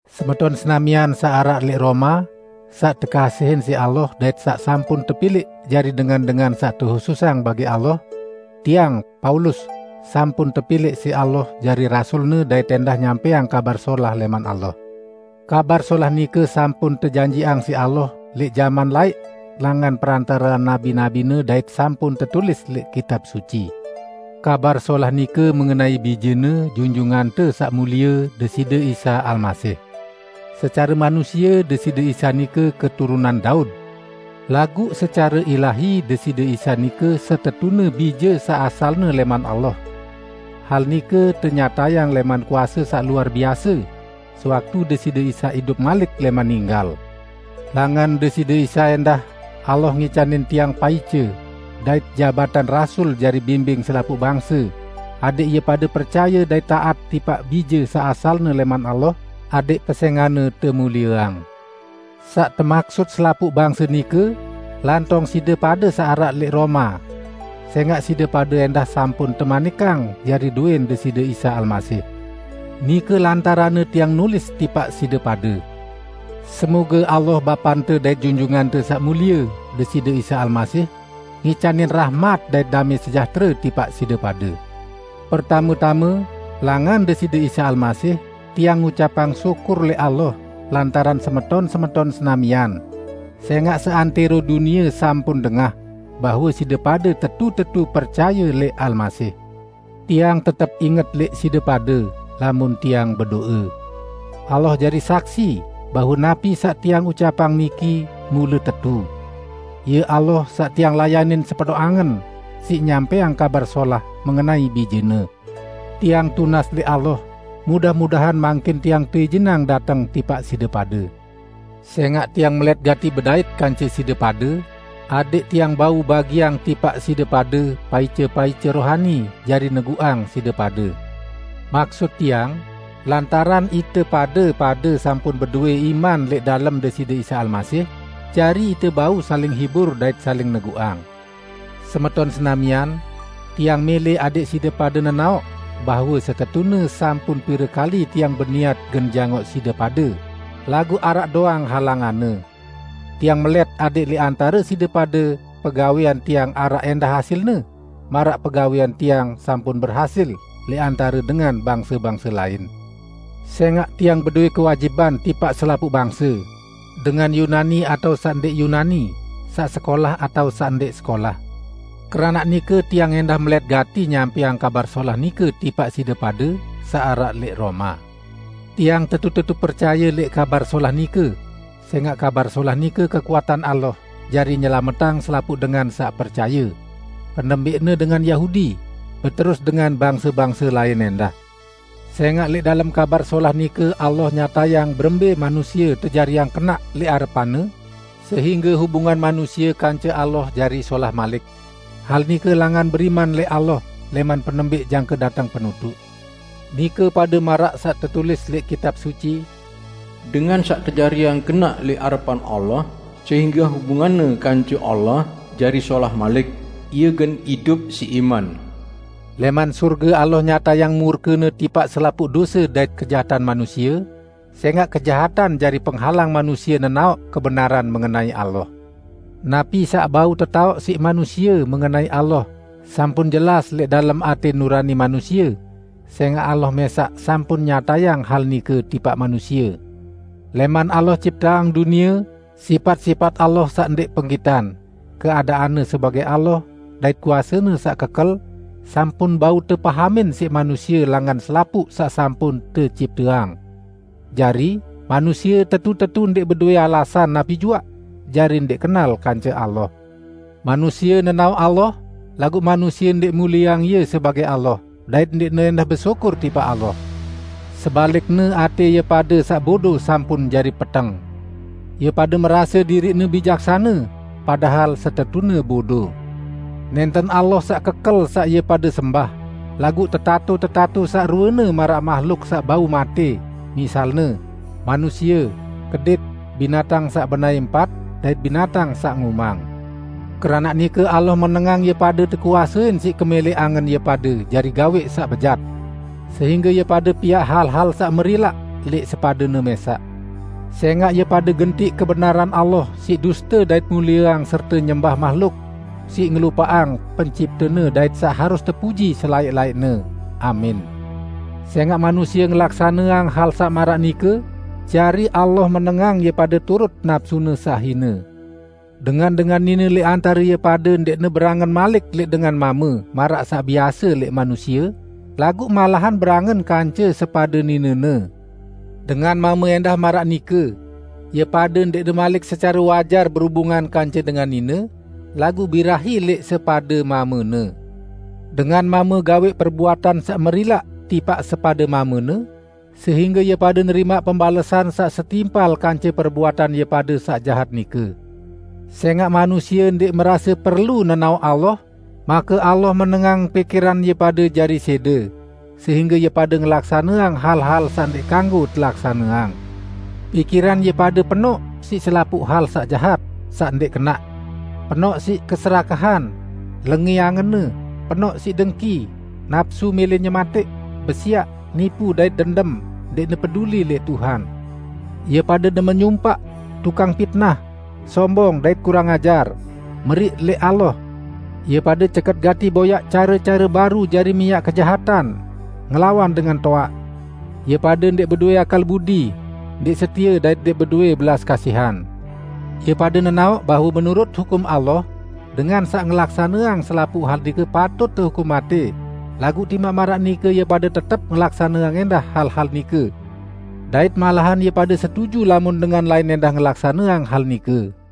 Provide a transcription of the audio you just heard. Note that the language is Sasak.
Semeton senamian saq araq lẽq Roma, saq tekasihin siq Allah dait saq sampun tepilẽq jari dengan-dengan saq tehususang bagi Allah. Tiang, Paulus, sampun tepilẽq siq Allah jari rasul-Ne dait ẽndah nyampẽang Kabar Solah lẽman Allah. Kabar Solah nike sampun tejanjiqang siq Allah lẽq jaman laẽq langan perantarean nabi-nabi-Ne dait sampun tetulis lẽq Kitab Suci. Kabar Solah nike mengenai Bije-Ne, Junjungante Saq Mulie Deside Isa Almasih. Secare manusie Deside Isa nike keturunan Daud, laguq secare ilahi Deside Isa nike setetune Bije saq asalne lẽman Allah. Hal nike tenyatayang lẽman kuase saq luar biase sewaktu Deside Isa idup malik lẽman ninggal. Langan Deside Isa ẽndah Allah ngicanin tiang paice dait jabatan rasul jari bimbing selapuq bangse adẽq ie pade percaye dait taat tipaq Bije saq asalne lẽman Allah adẽq pesẽngan-Ne temulieang. Saq temaksut selapuq bangse nike, lantong side pade saq araq lẽq Roma; sẽngaq side pade ẽndah sampun temanikang jari dowẽn Deside Isa Almasih. Nike lantaranne tiang nulis tipaq side pade. Semoge Allah Bapante dait Junjungante Saq Mulie Deside Isa Almasih, ngicanin rahmat dait damẽ sejahtere tipaq side pade. Pertame-tame, langan Deside Isa Almasih, tiang ngucapang syukur lẽq Allah lantaran semeton-semeton senamian; sẽngaq seantẽro dunie sampun dengah bahwe side pade tetu-tetu percaye lẽq Almasih. Tiang tetep inget lẽq side pade lamun tiang bedo'e. Allah jari saksi bahwe napi saq tiang ucapang niki mule tetu. Ie Allah saq tiang layanin sepenoq angen siq nyampẽang Kabar Solah mengenai Bije-Ne. Tiang tunas lẽq Allah mudah-mudahan mangkin tiang teijinang dateng tipaq side pade. Sẽngaq tiang melẽt gati bedait kance side pade, adẽq tiang bau bagiang tipaq side pade paice-paice rohani jari neguqang side pade. Maksut tiang, lantaran ite pade-pade sampun bedowẽ iman lẽq dalem Deside Isa Almasih, jari ite bau saling hibur dait saling neguqang. Semeton senamian, tiang mẽlẽ adẽq side pade nenaoq bahwe setetune sampun pire kali tiang beniat gen jangoq side pade, laguq araq doang halanganne. Tiang melẽt adẽq lẽq antare side pade pegawẽan tiang araq ẽndah hasilne maraq pegawẽan tiang sampun berhasil lẽq antare dengan bangse-bangse lain. Sẽngaq tiang bedowẽ kewajiban tipaq selapuq bangse: Dengan Yunani atao saq ndẽq Yunani, saq sekolah atao saq ndẽq sekolah. Keranaq nike tiang ẽndah melẽt gati nyampẽang Kabar Solah nike tipaq side pade saq araq lẽq Roma. Tiang tetu-tetu percaye lẽq Kabar Solah nike, sẽngaq Kabar Solah nike kekuatan Allah jari nyelametang selapuq dengan saq percaye; penembẽqne dengan Yahudi, beterus dengan bangse-bangse lain ẽndah. Sẽngaq lẽq dalem Kabar Solah nike Allah nyatayang berembẽ manusie tejariang kenaq lẽq arepan-Ne sehingge hubungan manusie kance Allah jari solah malik; hal nike langan beriman lẽq Allah lẽman penembẽq jangke dateng penutuq. Nike pade maraq saq tetulis lẽq Kitab Suci, "Dengan saq tejariang kenaq lẽq arepan Allah sehingge hubunganne kance Allah jari solah malik, ie gen idup siq iman!" Lẽman sorge Allah nyatayang murke-Ne tipaq selapuq dose dait kejahatan manusie, sẽngaq kejahatan jari penghalang manusie nenaoq kebenaran mengenai Allah. Napi saq bau tetaoq siq manusie mengenai Allah sampun jelas lẽq dalem atẽ nurani manusie, sẽngaq Allah mẽsaq sampun nyatayang hal nike tipaq manusie. Lẽman Allah cipteang dunie, sipat-sipat Allah saq ndẽq penggitan, keadaan-Ne sebagẽ Allah dait kuase-Ne saq kekel, sampun bau tepahamin siq manusie langan selapuq saq sampun tecipteang. Jari, manusie tetu-tetu ndẽq bedowẽ alasan napi juaq jari ndẽq kenal kance Allah. Manusie nenaoq Allah, laguq manusie ndẽq mulieang Ie sebagẽ Allah, dait ndẽqne ẽndah besyukur tipaq Allah. Sebalikne, atẽ ie pade saq bodo sampun jari peteng. Ie pade merase diriqne bijaksane, padahal setetune bodo. Nẽnten Allah saq kekel saq ie pade sembah, laguq tetato-tetato saq ruene maraq mahluk saq bau matẽ, misalne: Manusie, kedit, binatang saq benaẽ empat dait binatang saq ngumang. Keranaq nike Allah menengang ie pade tekuasein siq kemẽlẽq angen ie pade jari gawẽq saq bejat. Sehingge ie pade piaq hal-hal saq merilaq lẽq sepadene mẽsaq. Sẽngaq ie pade gentiq kebenaran Allah siq duste dait mulieang serte nyembah mahluk, siq ngelupaqang Penciptene saq harus tepuji selaẽq-laẽqne, amin. Sẽngaq manusie ngelaksaneang hal saq maraq nike, jari Allah menengang ie pade turut napsune saq hine. Dengan-dengan nine lẽq antare ie pade ndẽqne berangen malik lẽq dengan mame maraq saq biase lẽq manusie, laguq malahan berangen kance sepade ninene. Dengan mame ẽndah maraq nike; ie pade ndẽqne malik secare wajar berubungan kance dengan nine, laguq birahi lẽq sepade mamene. Dengan mame gawẽq perbuatan saq merilaq tipaq sepade mamene, sehingge ie pade nerimaq pembalesan saq setimpal kance perbuatan ie pade saq jahat nike. Sẽngaq manusie ndẽq merase perlu nenaoq Allah, make Allah menengang pikiran ie pade jari sẽde sehingge ie pade ngelaksaneang hal-hal saq ndẽq kanggo telaksaneang. Pikiran ie pade penoq siq selapuq hal saq jahat, saq ndẽq kenaq; penoq siq keserakahan, lengẽ angenne, penoq siq dengki, napsu mẽlẽ nyematẽq, besiaq, nipu dait dendem, ndẽqne peduli lẽq Tuhan, ie pade demen nyumpaq, tukang pitnah, sombong dait kurang ajar, meriq lẽq Allah. Ie pade ceket gati boyaq care-care baru jari miaq kejahatan, ngelawan dengan toaq. Ie pade ndẽq bedowẽ akal budi, ndẽq setie dait ndẽq bedowẽ belas kasihan. Ie pade nenaoq bahwe menurut hukum Allah, dengan saq ngelaksaneang selapuq hal nike patut tehukum matẽ, laguq timaq maraq nike ie pade tetep ngelaksaneang ẽndah hal-hal nike; dait malahan ie pade setuju lamun dengan lain ẽndah ngelaksaneang hal nike.